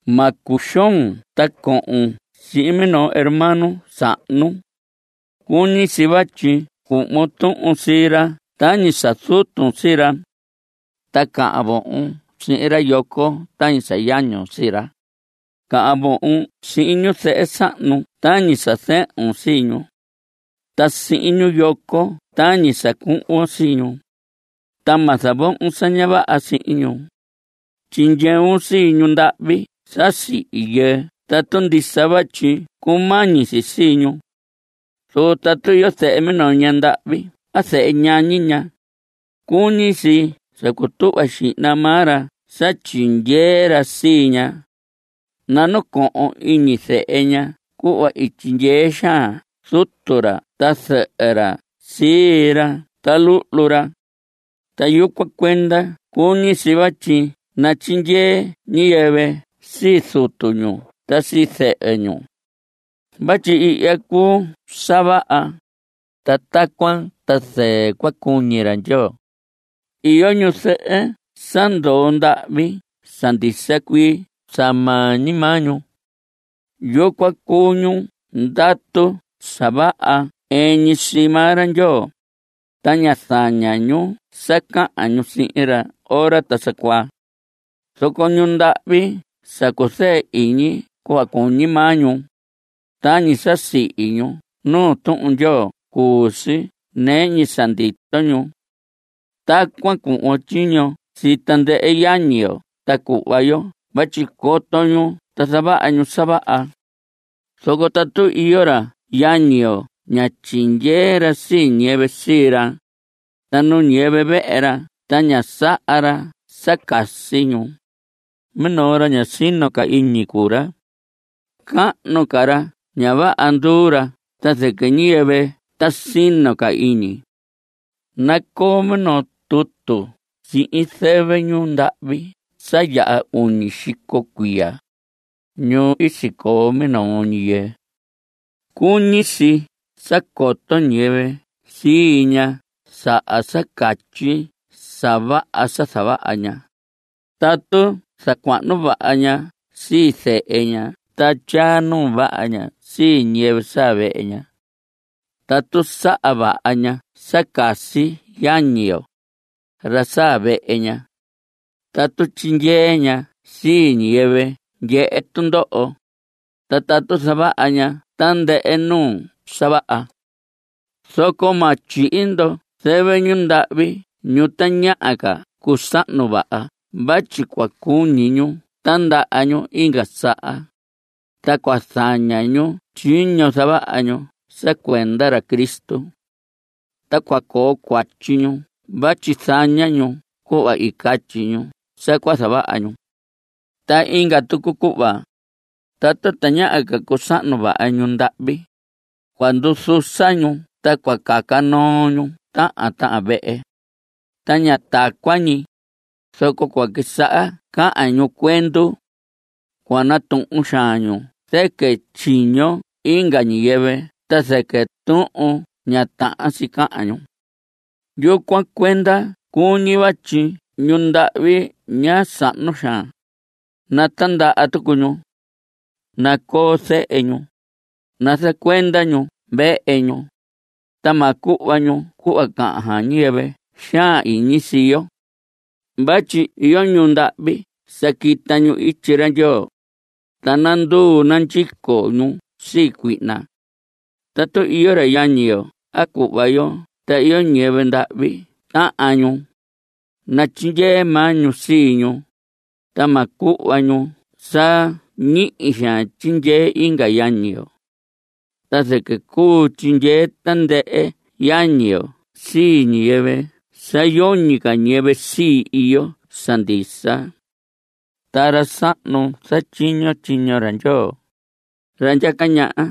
Ma cuxoon ta cohon sihin minoo hermano sahnu. Cuñi si vatyi cuhvon tuhun sii ra tañi sa zutun sii ra. Ta cahan vohon sihin ra yoco tañi sa yañun sii ra. Cahan vohon sihin ñuzɨhɨ sahnu tañi sa zɨhun sii ñu. Ta sihin ñu yoco tañi sa cuhvon sii ñu. Ta ma zavohon sa ña vaha sihin ñu. Tyindyeun sii ñu ndahvi sa sihi yɨɨ tatu ndisa vatyi cumañi si sii ñu. Zoco tatu iyo zehe minoo ña ndahvi a zehe ñañi ña, cuñi si sa cutuhva xihna maa ra sa tyindyee ra sii ña. Nanacohon iñi zehe ña cuhva i tyindyee xaan zutu ra ta zɨhɨ ra sii ra ta luhlu ra. Ta yucuan cuenda cuñi si vatyi natyindyee ñiyɨvɨ sii zutu ñu a sii zɨhɨ ñu. Vatyi ihya cuu sa vaha, ta tacuan ta zɨɨ cua cuñi ra Ndyoo. Iyo ñuzɨhɨ sa ndoo ndahvi sa ndisa cuii sa maa ñi maa ñu. Yucuan cuu ñu ndatu sa vaha ɨɨn ñi sii maa ra Ndyoo, ta ña zaña ñu sa cahan ñu sihin ra ora ta sa cuaa. Zoco ñu ndahvi sa cuzɨɨ iñi cuhva cuñi maa ñu, tañi sa sihi ñu nuu Tuhun Ndyoo cuu si nɨɨ ñi sa ndito ñu. Tacuan cuhvon tyiño sii tandɨhɨ yañi yo ta cuhva yo vatyi coto ñu ta zavaha ñu sa vaha. Zoco tatu iyo ra yañi yo ña tyindyee ra sii ñiyɨvɨ sii ra, ta nu ñiyɨvɨ vehe ra ta ña saha ra sa casi ñu, minoo ra ña sino ca iñi cuu ra. Cahnu ca ra ña vaha nduu ra ta zɨquɨ ñiyɨvɨ ta sino ca iñi. Nacoo minoo tutu sihin zɨvɨ ñu ndahvi sa yaha uñi xico cuiya, ñu i sicoo minoo ñi yɨɨ. Cuñi si sa coto ñiyɨvɨ sii ña saha sa catyi sa vaha sa zavaha ña, tatu zacuahnu vaha ña sii zehe ña ta tyaa nuu vaha ña sii ñiyɨvɨ saa vehe ña. Tatu saha vaha ña sa casi yañi yo, ra saa vehe ña. Tatu tyindyee ña sii ñiyɨvɨ ndyehe tundoho, ta tatu zavaha ña tandɨhɨ nuu sa vaha. Zoco ma tyihi ndo zɨvɨ ñu ndahvi ñu tañaha ca cusahnu vaha vatyi cua cuñi ñu tindaha ñu inga saha, ta cua zaña ñu tyiño zavaha ñu sa cuenda ra Cristo. Ta cua coo cuatyi ñu vatyi zaña ñu cuhva i catyi ñu sa cua zavaha ñu. Ta inga tucu cuhva, tatu tañaha ca cusahnu vaha ñu ndahvi, cua nduzusa ñu ta cua caca noo ñu tahan tahan vehe. Ta ña tacuan ñi, zoco cua quisaha cahan ñu cuendu. Cua natuhun xaan ñu zɨquɨ tyiño inga ñiyɨvɨ ta zɨquɨ tuhun ña tahan si cahan ñu. Yucuan cuenda cuñi vatyi ñu ndahvi ña sahnu xaan, natindaha tucu ñu. Nacoo zehe ñu. Nazacuenda ñu vehe ñu, ta ma cuhva ñu cuhva cahan xaan ñiyɨvɨ xaan iñi sii yo. Vatyi iyo ñu ndahvi sa quita ñu ityi ra Ndyoo, ta nanduu nandyico ñu sii cuihna. Tatu iyo ra yañi yo a cuhva yo ta iyo ñiyɨvɨ ndahvi tahan ñu, natyindyee maa ñu sii ñu, ta ma cuhva ñu sa ñihi xaan tyindyee inga yañi yo. Ta zɨquɨ cuu tyindyee tandɨhɨ yañi yo sii ñiyɨvɨ sa yoñi ca ñiyɨvɨ sii, iyo sa ndisa. Ta ra sahnu zatyiño tyiño ra Ndyoo, ra ndyaca ñaha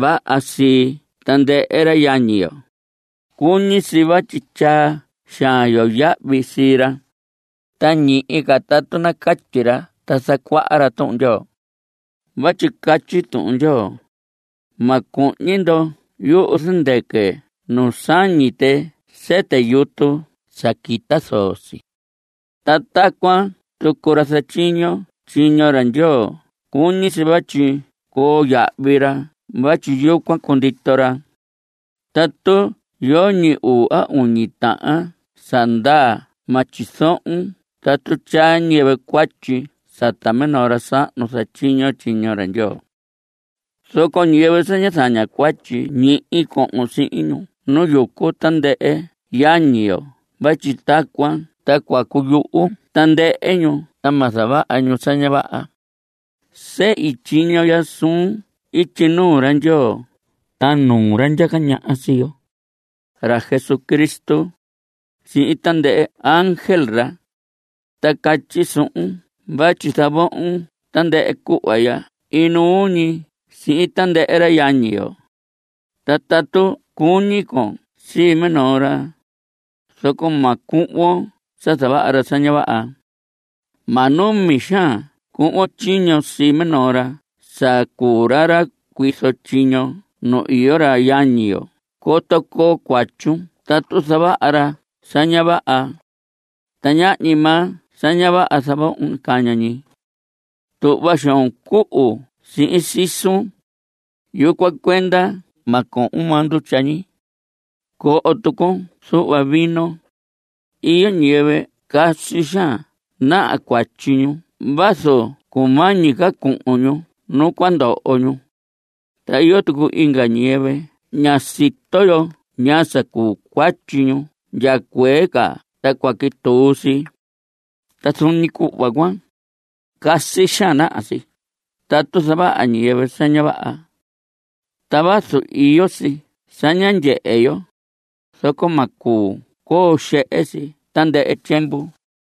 vaha sii tandɨhɨ ra yañi yo, cuñi si vatyi tyaa xaan yo yahvi sii ra, ta ñihi ca tatu nacatyi ra ta zacuaha ra Tuhun Ndyoo. Vatyi catyi Tuhun Ndyoo: “Ma cuhñi ndo yuhu zɨndɨquɨ nu sañi tɨ sɨtɨ yutu sa quita zoo si.” Ta tacuan tucu: “Ra zatyiño tyiño ra Ndyoo cuñi si vatyi coo yahvi ra vatyi yucuan cundito ra.” Tatu yoñi uu a uñi tahan sa ndaa ma tyizohon tatu tyaa ñiyɨvɨ cuatyi sata minoo ra sahnu zatyiño tyiño ra Ndyoo. Zoco ñiyɨvɨ sa ña zaña cuatyi, ñihi cohon sihin ñu nu yucu tandɨhɨ yañi yo vatyi tacuan ta cua cuyuhu tandɨhɨ ñu ta ma zavaha ñu sa ña vaha. Sehi tyiño ya suun ityi nuu ra Ndyoo ta nuu ra ndyaca ñaha sii yo, ra Jesucristo, sihin tandɨhɨ ángel ra, ta catyi suhun vatyi zavohon tandɨhɨ cuhva ya inuu ñi sihin tandɨhɨ ra yañi yo. Ta tatu cuñi con sii minoo ra, zoco ma cuhvon sa zavaha ra sa ña vaha. Ma numi xaan cuhvon tyiño sii minoo ra sa cuu ra ra cuizo tyiño nu iyo ra yañi yo coto coo cuatyun tatu zavaha ra sa ña vaha. Ta ñahñi maa sa ña vaha zavohon caña ñi. Tuhva xoon cuhu sihin sisun, yucuan cuenda ma cohon maa ndutya ñi. Coho tucun zuhva vino. Iyo ñiyɨvɨ casi xaan naha cuatyi ñu vazu cumañi ca cuhun ñu nu cua ndoho ñu. Ta iyo tucu inga ñiyɨvɨ ña sito yo ñaa sa cuu cuatyi ñu ndya cuee ca ta cua quituu si. Ta zuun ñi cuhva cuan, casi xaan naha si tatu zavaha ñiyɨvɨ sa vaha. Ta vazu iyo si sa ña ndyehe yo, zoco ma cuu coo xehe si tandɨhɨ tyiemvu.